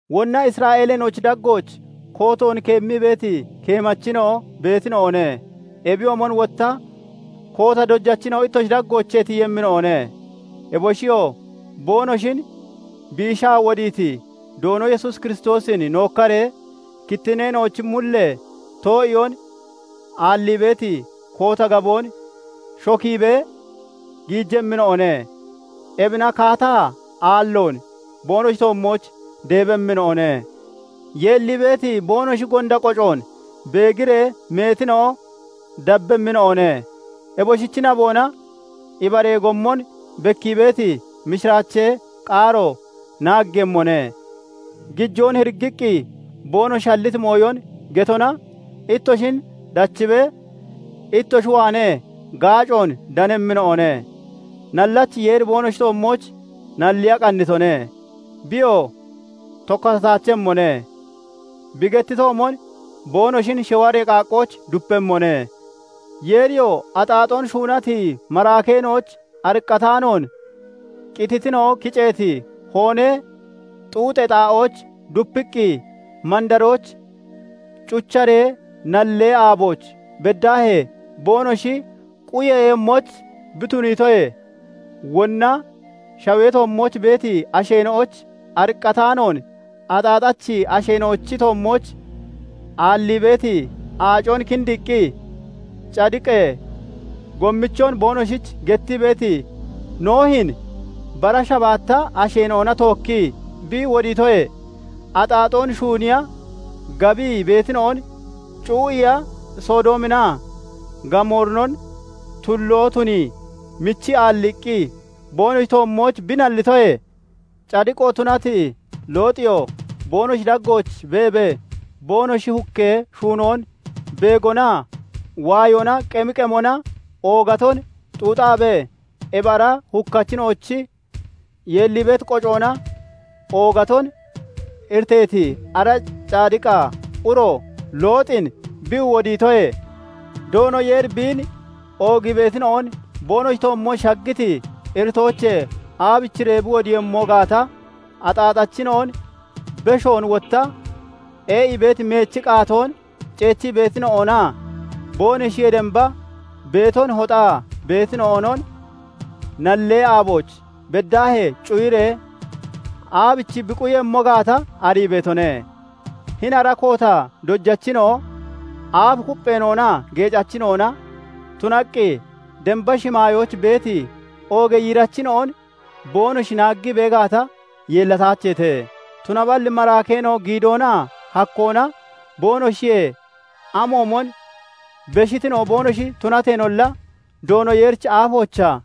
Wonna Isra'eeleena'ochi daggooch kootoon keemmii beeti keemachina'o beetina'one; ebiyoomon wotta koota dojachina'o ittoshi daggoochee tiyemmina'one; eboshiyoo boonoshin biishaa wodiiti Doono Yesuus Kiristoosin nookkaree, kittinneena'ochi mullee too'iyoon aallii beeti koota gaboon shokiibee giijemmina'one; ebina kaataa aalloon boonoshi toommooch deebemmina'one. Yeellii beeti boonoshi gonda qocoon beegiree meetina'o dabbemmina'one; eboshichi naboona ibaree gommon bekkii beeti mishiraachee qaaro naaggeeyemmone. Gijoon hiriggiqqi boonoshi halliti mooyon getona ittoshin dachibee ittoshi waanee gaacoon danemmina'one; nallachi Yeeri boonoshi toommooch nalliya qannitone; biyoo tokkatataachemmone; bi gettitoomon boonoshin shiwaree qaaqqooch dupemmone. Yeeriyoo axaaxoon shuunati maraakeena'oyich ariqqataanoon, qititina'o kiceeti hoonee xuuxee xaa'ooch dupiqqi, mandarooch cucharee nallee aabooch beddaahee boonoshi quyeeyemmoyich bi tuniitoyee, wonna shawee toommooch beeti asheena'oyich ariqqataanoon, axaaxachi asheena'ochi toommooch aallii beeti aacon kindiiqqi, cadiqee gommichon boonoshich gettii beeti Noohin bara shabaatta asheena'ona tookkii bi wodiitoyee, axaaxoon shuuniya gabii beetina'on cuu'iiya Sodoominaa Gamoorinon tulloo tunii michii aalliiqqi boonoshi toommooch bi nallitoyee, cadiqo tunati Looxiyoo boonoshi daggooch beebee boonoshi hukkee shuunoon beegonaa waayoona qemi qemona oogaton xuuxaabee ebi ara hukkachina'ochi yeellii beeti qocoona oogaton iriteeti ara cadiqa uro Looxin bi wodiitoyee, Doono Yeeri biin oogii beetina'on boonoshi toommooch shaggiti iritoochee aabichiree bi wodiiyemmo gaata, axaaxachina'on, beshoon wotta ee'ii beeti meechi qaatoon ceechii beetina'onaa boonoshiyee damba beeton hoxaa beetina'onon nallee aabooch beddaahee cuyiree aabichi bi quyemmo gaata arii beetone. Hini ara koota dojachina'o aaf kuppheena'onaa geecachina'ona tunaqqi damba shimaayooch beeti oogee yiirachina'on boonoshi naaggii bee gaata, yeellataacheete; tunaballi maraakeena'o giidoonaa hakkoona boonoshiyee amoomon beshitina'o boonoshi tunateenolla, Doono Yeerichi aafoochaa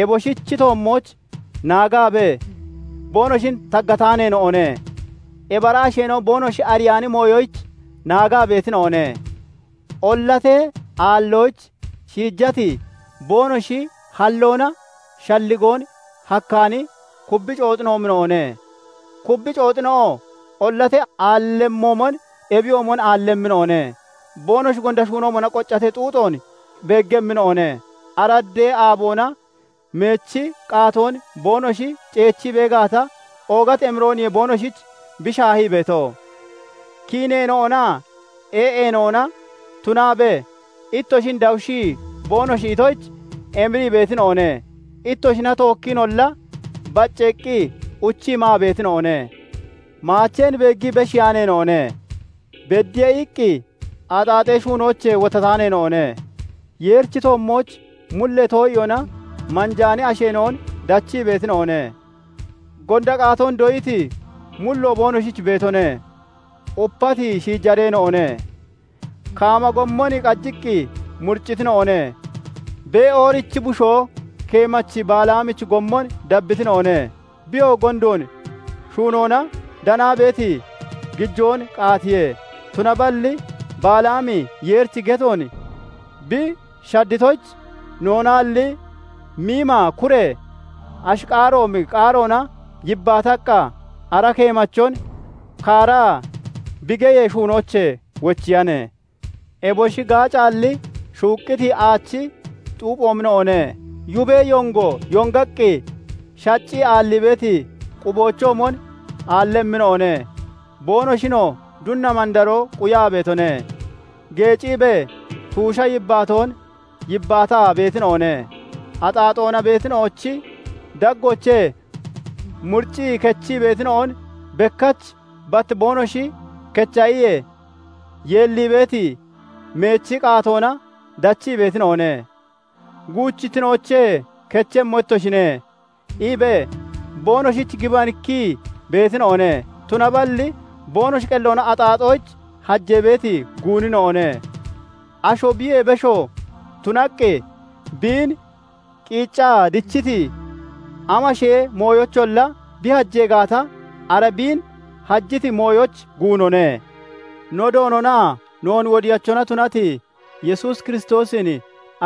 eboshichi toommooch naagaabee boonoshin taggataaneena'one. Ebi ara asheena'o boonoshi ariyaani mooyoyich naagaa beetina'one; ollatee aalloyich shiijati, boonoshi halloona shalligoon hakkaani kubbi cooxoomina'one; kubbi cooxina'oo ollatee aallemmoomon ebiyoomon aallemmina'one. Boonoshi gonda shuunoomona qoccatee xuuxoon beeggemmina'one; araddee aaboona meechi qaatoon boonoshi ceechii bee gaata, oogati emirooniye boonoshich bi shaahii beeto; kiineena'onaa ee'eena'ona tunaabee ittoshin dawushii boonoshi itoyich emirii beetina'one; ittoshina tookkiinolla bacceeqqi uchii maa beetina'one. Maacheen beeggii beshiiyaaneena'one; "Beddiye" iqqi axaaxee shuunoochee wottataaneena'one; Yeerichi toommooch mullee too'iyoona manjaani asheena'on dachii beetina'one; gonda qaatoon doyiti mullo boonoshich beetone; upati shiijareena'one. Kaama gommon qajiqqi muriccitina'one; Be'oorichi bushoo keemachi Balaamichi gommon dabbitina'one; biyoo gondoon shuunoona danaa beeti gijoon qaatiye. Tunaballi Balaami Yeerichi getoon bi shaaddatoyich, noonaalli miima kure ashi qaaroomi qaaroona yibbaataqqa ara keemachon kaaraa bi geyee shuunoochee wochiyane. Eboshi gaacaalli, shuuqqiti aachi xuuphoomina'one; yubee yongo yongaqqi shaccii aallii beeti quboochoomon aallemmina'one; boonoshinoo dunna mandaroo quyaa beetone. Geeciibee tuusha yibbaatoon yibbaataa beetina'one; axaaxoona beetina'ochi daggoochee muriccii kechii beetina'on, bekkach bat boonoshi kecha iyee, yeellii beeti meechi qaatoona dachii beetina'one. "Guuchittinoochee kechemmo ittoshine" iibee boonoshich gibanikkii beetina'one; tunaballi boonoshi qelloona axaaxoyich hajee beeti guunina'one. Asho biyee besho tunaqqi biin qiiccaa dichiti amashee mooyoyicholla bi hajee gaata, ara biin hajiti mooyoyich guunone. No Doononaa noon Wodiyachona tunati Yesuus Kiristoosin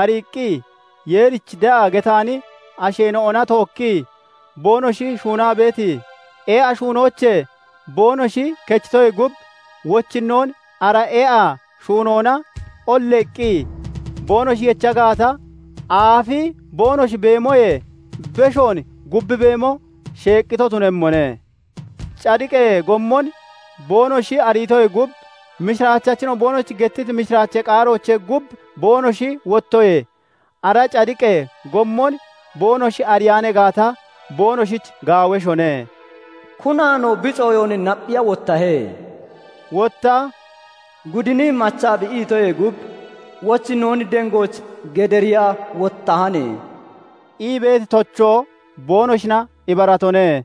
ariiqqi, Yeerich de'a getaani asheena'ona tookkii boonoshi shuunaa beeti ee'a shuunoochee boonoshi kechitoyee gub, wochinnoon ara ee'a shuunoona olleeqqi boonoshi yecha gaata, aafi boonoshi beemoyee beshoon gubbi beemo sheeqqito tunemmone. Cadiqee gommon boonoshi ariitoyee gub, mishiraachachina'o boonoshich gettiti mishiraachee qaaroochee gub boonoshi wottoyee, ara cadiqee gommon boonoshi ariyaan gaata, boonoshich gaaweshone. "Kunaanoo bi cooyoon napphiya wottahe"; wotta Gudini machaa bi itoyee gub wochinnoon dengooch gediriya wottahane" ii beeti tochoo boonoshina ibaratone.